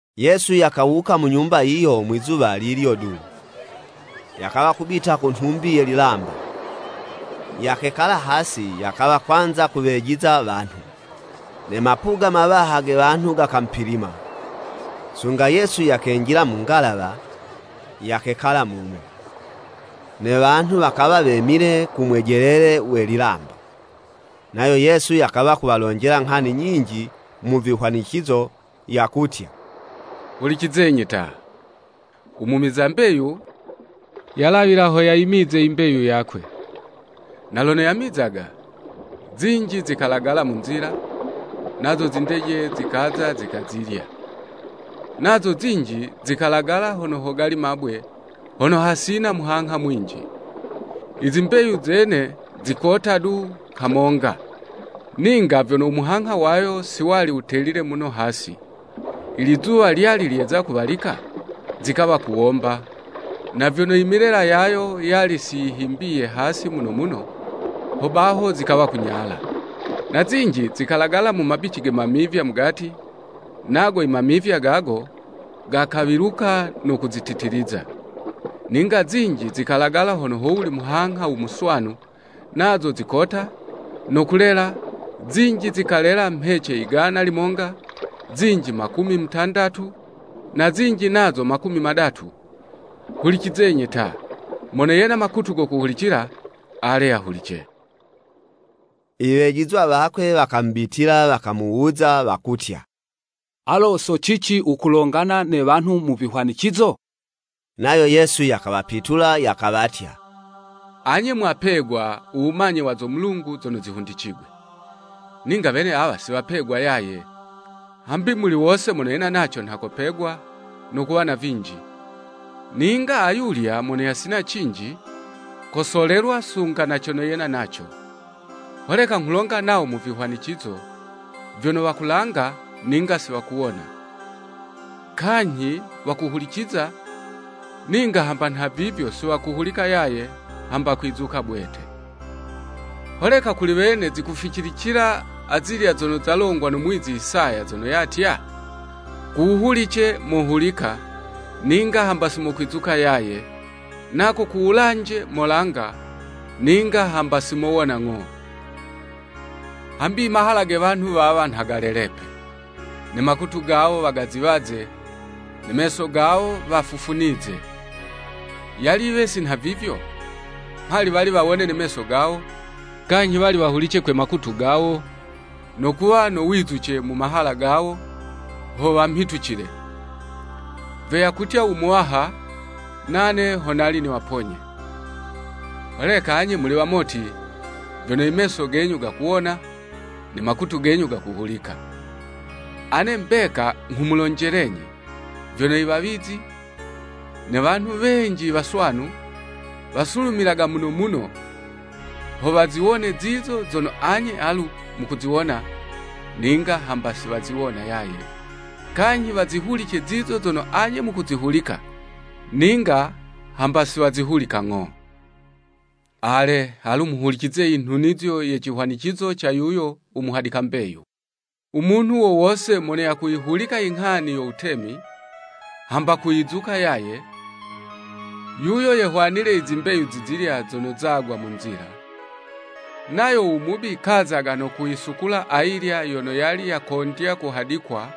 Yesu yakawuka mu nyumba yiyo mwizuwa lilyo du, yakawa kubita ku nhumbi ye lilamba, yakekala hasi yakawa kwanza kuwejiza wanhu. Ne mapuga mawaha ge wanhu gakamupilima, sunga Yesu yakenjila mu ngalawa, yakekala mumo. Ne wanhu wakawa wemile ku mwejelele we lilamba, nayo Yesu yakawa kuwalonjela nghani nyinji mu vihwanicizo, yakutya, “Hulicizenyi ta! U mumiza mbeyu, yalawila ho yayimize i mbeyu yakwe. Na lono yamizaga, zinji zikalagala mu nzila, nazo zindeje zikaza zikazilya. Nazo zinji zikalagala hono hogali mabwe hono hasina muhangha mwinji. I zimbeyu zene zikota du kamonga, ninga vyono umuhangha wayo si wali wutelile muno hasi. Ilizuwa lyali lyeza kuwalika, zikawa kuwomba, na vyono i milela yayo yali si yihimbiye hasi muno muno, hobaho zikawa kunyala. Na zinji zikalagala mu mabici ge mamivya mugati, nago i mamivya gago, gakawiluka no kuzititiliza. Ninga zinji zikalagala hono howuli muhangha u muswanu, nazo zikota, no kulela, zinji zikalela mhece igana limonga, zinji makumi mutandatu, na zinji nazo makumi madatu. Hulicizenyi ta, mono yena makutu go kuhulicila, ale yahulice!” I wejizwa wakwe wakamubitila wakamuwuza wakutya, “Alo so cici wukulongana ne wanhu mu vihwanicizo?” Nayo Yesu yakawapitula yakawatya, “Anye mwapegwa u wumanye wa zo Mulungu zono zihundicigwe, ninga wene awa si wapegwa yaye. Hambi muli wose mono yena naco nha kopegwa, no kuwa na vinji, ninga ayulya mono yasina cinji, kosolelwa sunga na cono yena naco. Holeka nghulonga nawo mu vihwanicizo, vyono wakulanga, ninga siwakuwona, kanyhi, wakuhuliciza, ninga hamba nhavivyo siwakuhulika yaye, hamba kwizuka bwete. Holeka kuli wene, zikuficilicila azilya zono zalongwa no muwizi Isaya zono yatya, ‘Kuwuhulice, mohulika, ninga hamba si mokwizuka yaye, nako ku wulanje molanga, ninga hamba si mowona ng'o. Hambi i mahala ge wanhu wawa nha galelepe, ne makutu gawo wagaziwaze, ne meso gawo wafufunize. Yali yiwe si nhavivyo, mhali wali wawone ne meso gawo, kanyhi wali wahulice kwe makutu gawo, no kuwa no wizuce mu mahala gawo ho wamhitucile, vyo yakutya u Muwaha, Nane ho nali niwaponye.’ “Holeka anye muli wamoti, vyono i meso genyu gakuwona, ne makutu genyu gakuhulika. Ane mbeka nghumulonjelenyi, vyono i wawizi, ne wanhu wenji i waswanu, wasulumilaga muno muno, ho waziwone zizo zono anye alu mukuziwona, ninga hamba si waziwona yaye, kanyhi wazihulice zizo zono anye mukuzihulika, ninga hamba si wazihulika ng'o.” “Ale, alu muhulicize i nhunizo ye cihwanicizo ca yuyo u muhadika mbeyu. U munhu wo wose mono yakuyihulika inghani yo Wutemi, hamba kuyizuka yaye, yuyo yo yehwanile i zimbeyu zizilya zono zagwa mu nzila, nayo u Mubi kazaga no kuyisukula ayilya yono yali yakondya kuhadikwa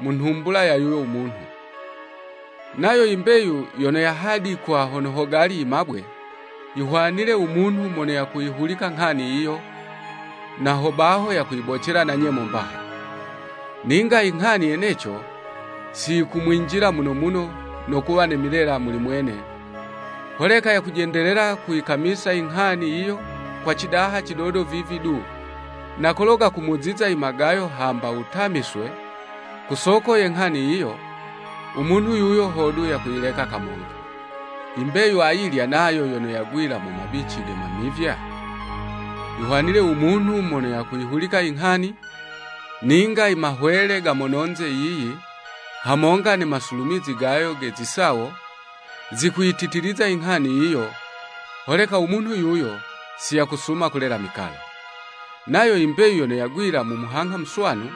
mu nhumbula ya yuyo munhu. Nayo i mbeyu yono yahadikwa hono hogali i mabwe, yihwanile u munhu mono yakuyihulika nghani yiyo, na hobaho yakuyibocela na nyemo mbaha. Ninga inghani yeneco si yikumwinjila muno muno no kuwa ne milela muli mwene, holeka yakujendelela kuyikamisa inghani yiyo kwa cidaha cidodo vivi du, na kolo gakumuziza i magayo hamba wutamiswe ku soko ye nghani yiyo, u munhu yuyo hodu yakuyileka kamonga. I mbeyu ayilya nayo yono yagwila mu mabici ge mamivya, yihwanile u munhu mono yakuyihulika inghani, ninga i mahwele ga mononze yiyi hamonga ne masulumizi gayo ge zisawo, zikuyititiliza inghani yiyo, holeka u munhu yuyo si yakusuma kulela mikalo. Nayo i mbeyu yono yagwila mu muhangha muswanu,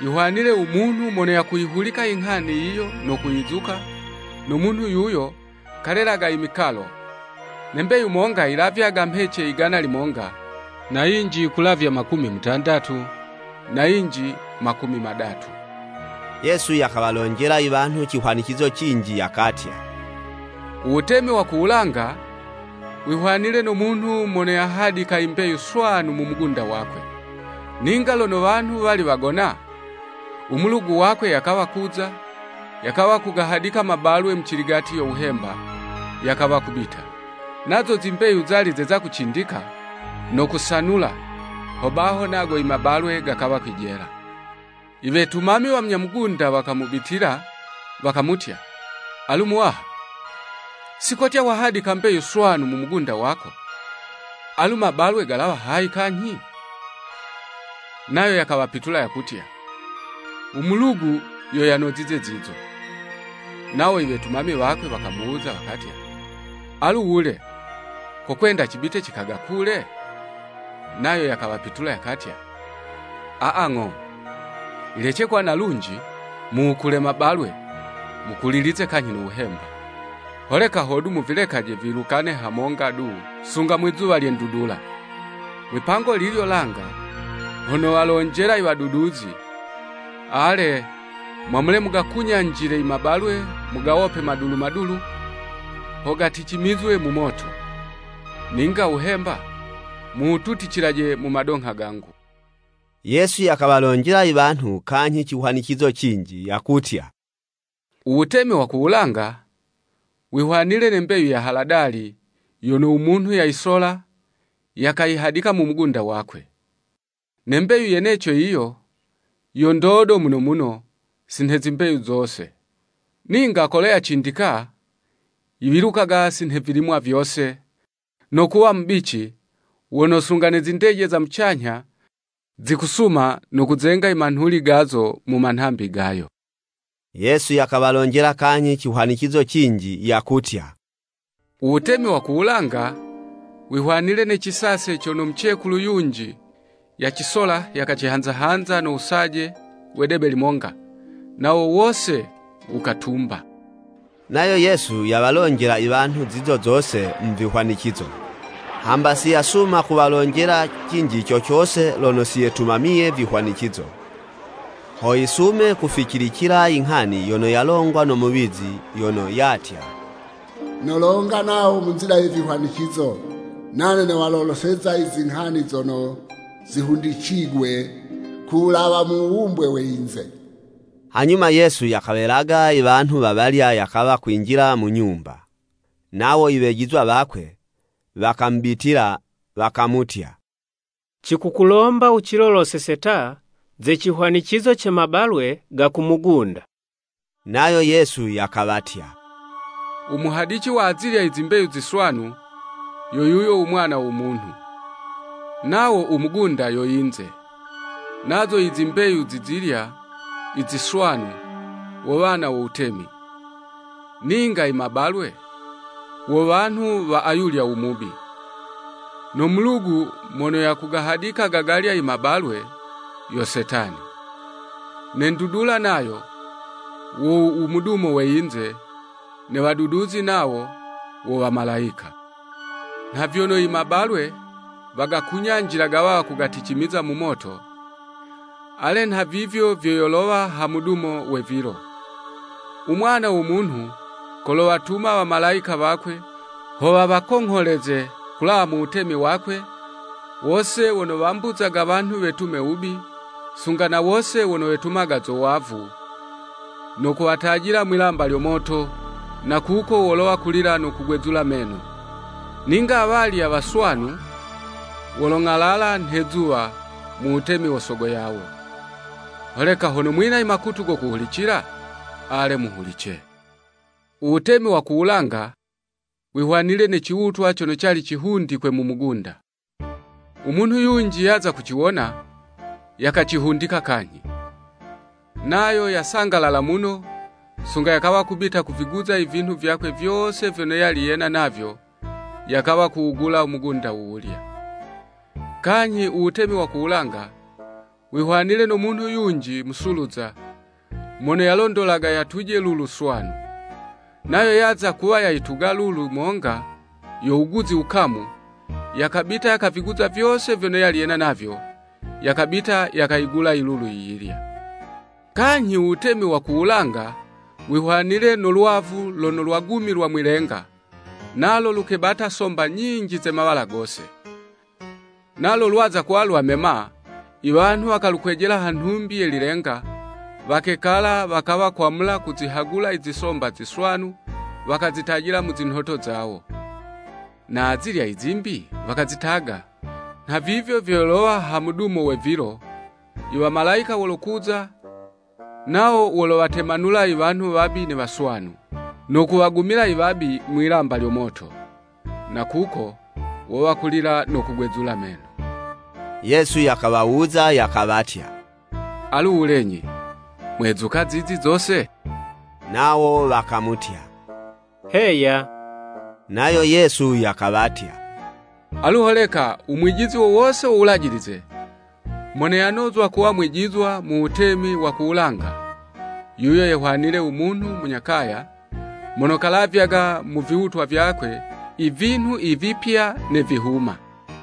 yihwanile u munhu mono yakuyihulika inghani yiyo no kuyizuka, no munhu yuyo kalelaga i mikalo, ne mbeyu monga yilavyaga mhece igana limonga, na yinji yikulavya makumi mutandatu, na yinji makumi madatu.” Yesu yakawalonjela i wanhu cihwanicizo cinji yakatya, “U wutemi wa ku wulanga, wihwanile no munhu mono yahadika i mbeyu swanu mu mugunda wakwe. Ninga lono wanhu wali wagona, u mulugu wakwe yakawa kuza, yakawa kugahadika mabalwe muciligati yo wuhemba, yakawa kubita. Nazo zimbeyu zali zeza kucindika, no kusanula, hobaho nago i mabalwe gakawa kwijela. I wetumami wa munya mugunda wakamubitila, wakamutya, Alu muwaha, si kotya wahadika mbeyu swanu mu mugunda wako, alu mabalwe galawa hayi kanyhi? Nayo yakawapitula yakawatya, ‘U mulugu yo yanozize zizo.’ Nawo i wetumami wakwe wakamuwuza wakatya, ‘Alu wule, kokwenda cibite cikagakule?’ Nayo yakawapitula yakatya, ‘Aa, ng'o, yilece kuwa na lunji mu wukule mabalwe, mukulilize kanyhi no wuhemba. Holeka hodu muvilekaje viwilukane hamonga du, sunga mwizuwa lye ndudula. Mwipango lilyo langa ho nowalonjela i waduduzi, ale, mwamule mugakunyanjile i mabalwe mugawope madulu madulu, ho gaticimizwe mu moto. Ninga wuhemba muwututicilaje mu madongha gangu.'" Yesu yakawalonjela i wanhu kanyhi cihwanicizo cinji yakutya, “U wutemi wa ku wulanga, wihwanile ne mbeyu ya haladali yono u munhu yayisola, yakayihadika mu mugunda wakwe. Ne mbeyu yeneco yiyo yo ndodo muno muno si nhe zimbeyu zose, ninga kolo yacindika, yiwilukaga si nhe vilimwa vyose, no kuwa mubici, wono sunga ne zindeje za mucanyha, zikusuma no kuzenga i manhuli gazo mu manhambi gayo.” Yesu yakawalonjela kanyhi cihwanicizo cinji yakutya, “U wutemi wa ku wulanga, wihwanile ne cisase cono mucekulu yunji yacisola yakacihanza-hanza no wusaje we debe limonga, nawo wose wukatumba.” Nayo Yesu yawalonjela i wanhu zizo zose mu vihwanicizo. Hamba si yasuma kuwalonjela cinji co cose lono si yetumamiye vihwanicizo, ho yisume kuficilicila i nghani yono yalongwa no muwizi yono yatya, “Nolonga nawo mu nzila ya vihwanicizo Nane nowaloloseza i zinghani zono zihundicigwe ku wulawa mu wuwumbwe we yinze.” Hanyuma Yesu yakawelaga i wanhu wawalya yakawa kwinjila mu nyumba. Nawo i wejizwa wakwe, wakamubitila, wakamutya, “Cikukulomba wuciloloseze ta ze cihwanicizo ce mabalwe ga ku mugunda.” Nayo Yesu yakawatya, “U muhadici wa azilya i zimbeyu ziswanu, yo yuyo u Mwana wo Munhu. Nawo u mugunda yo yinze. Nazo i zimbeyu zi zilya i ziswanu, wo wana wo wutemi. Ninga i mabalwe, wo wanhu wa ayulyo u Mubi. No mulugu mono yagahadika gagalya i mabalwe, yo Setani. Ne ndudula nayo, wo u mudumo we yinze, ne waduduzi nawo, wo Wamalayika. Nha vyono i mabalwe, wagakunyanjilaga wawa gaticimiza mu moto, ale nhavivyo vyo yolowa ha mudumo we vilo, U Mwana wo Munhu kolowatuma wamalayika wakwe, ho wawakongholeze kulawa mu wutemi wakwe, wose wono wambuzaga wanhu wetume wubi, sunga na wose wono wetumaga zo wavu, no kuwatajila mwi'lamba lyo moto, na kuko wolowa kulila no kugwezula meno. Ninga awalya waswanu, wolong'alala nhe 'zuwa mu Wutemi wo Sogo yawo. Holeka hono mwina i makutu go kuhulicila, ale, muhulice!” “U wutemi wa ku wulanga wihwanile ne ciwutwa cono cali cihundikwe mu mugunda. U munhu yunji yaza kuciwona, yakacihundika kanyhi. Nayo yasangalala muno, sunga yakawa kubita kuviguza i vinhu vyakwe vyose vyono yali yena navyo yakawa kuwugula u mugunda wuwulya.” “Kanyhi, u Wutemi wa ku wulanga, wihwanile no munhu yunji musuluza, mono yalondolaga yatuje lulu swanu. Nayo yaza kuwa yayituga lulu monga yo wuguzi wukamu, yakabita yakaviguza vyose vyono yali yena navyo, yakabita yakayigula i lulu yiyilya.” “Kanyhi u Wutemi wa ku wulanga wihwanile no lwavu lono lwagumilwa mwilenga, nalo lukebata somba nyinji ze mawala gose. Nalo lwaza kuwa lwamema, i wanhu wakalukwejela ha nhumbi ye lilenga, wakekala, wakawa kwamula kuzihagula i zisomba ziswanu wakazitajila mu zinhoto zawo, na azilya i zimbi wakazitaga. Nhavivyo vyo yolowa ha mudumo we vilo, i wamalayika wolokuza nawo wolowatemanula i wanhu wabi ne waswanu. No kuwagumila i wabi mwi'lamba lyo moto. Na kuko wowa kulila no kugwezula meno.” Yesu yakawawuza yakawatya, “Alu wulenyi, mwezuka zizi zose?” Nawo wakamutya, “Heya.” Nayo Yesu yakawatya, “Alu holeka u mwijizi wo wose wo Wulajilize, mono yanozwa kuwa mwijizwa mu Wutemi wa ku wulanga, yuyo yehwanile u munhu munya kaya, mono kalavyaga mu viwutwa vyakwe i vinhu i vipya ne vihuma.”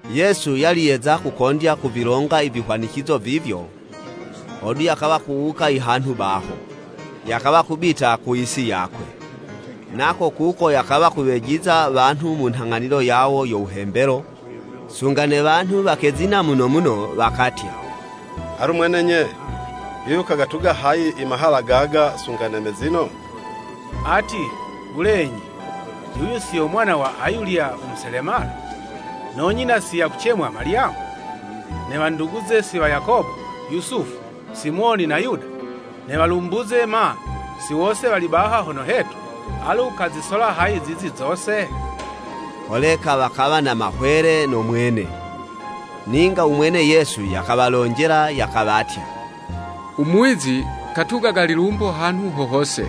Yesu yali yeza kukondya kuvilonga i vihwanicizo vivyo, hodu yakawa kuwuka i hanhu baho, yakawa kubita ku yisi yakwe. Nako kuko yakawa yakuwejiza wanhu mu nhang'anilo yawo yo wuhembelo, sunga ne wanhu wakezina muno muno, wakatya, “Alu mwene nye, yuyu kagatuga hayi i mahala gaga, sunga ne mezino? Ati, wulenyi, yuyu si yo mwana wa ayulya u muselemala? No nyina si yakucemwa Malyamu, ne wanduguze si wa Yakobo, Yusufu, Simoni na Yuda? Ne walumbuze ma, si wose wali baha hono hetu? Alu kazisola hayi zizi zose?” Holeka wakawa na mahwele no mwene. Ninga u mwene Yesu yakawalonjela yakawatya, “U muwizi katugaga lilumbo hanhu ho hose,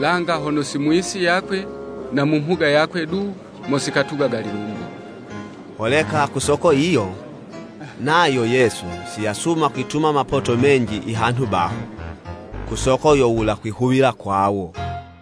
langa hono si mu yisi yakwe na mu mhuga yakwe du mo sikatugaga lilumbo!” Holeka ku soko yiyo, nayo Yesu si yasuma kwituma mapoto menji i hanhu baho, ku soko yo wula kwihuwila kwawo.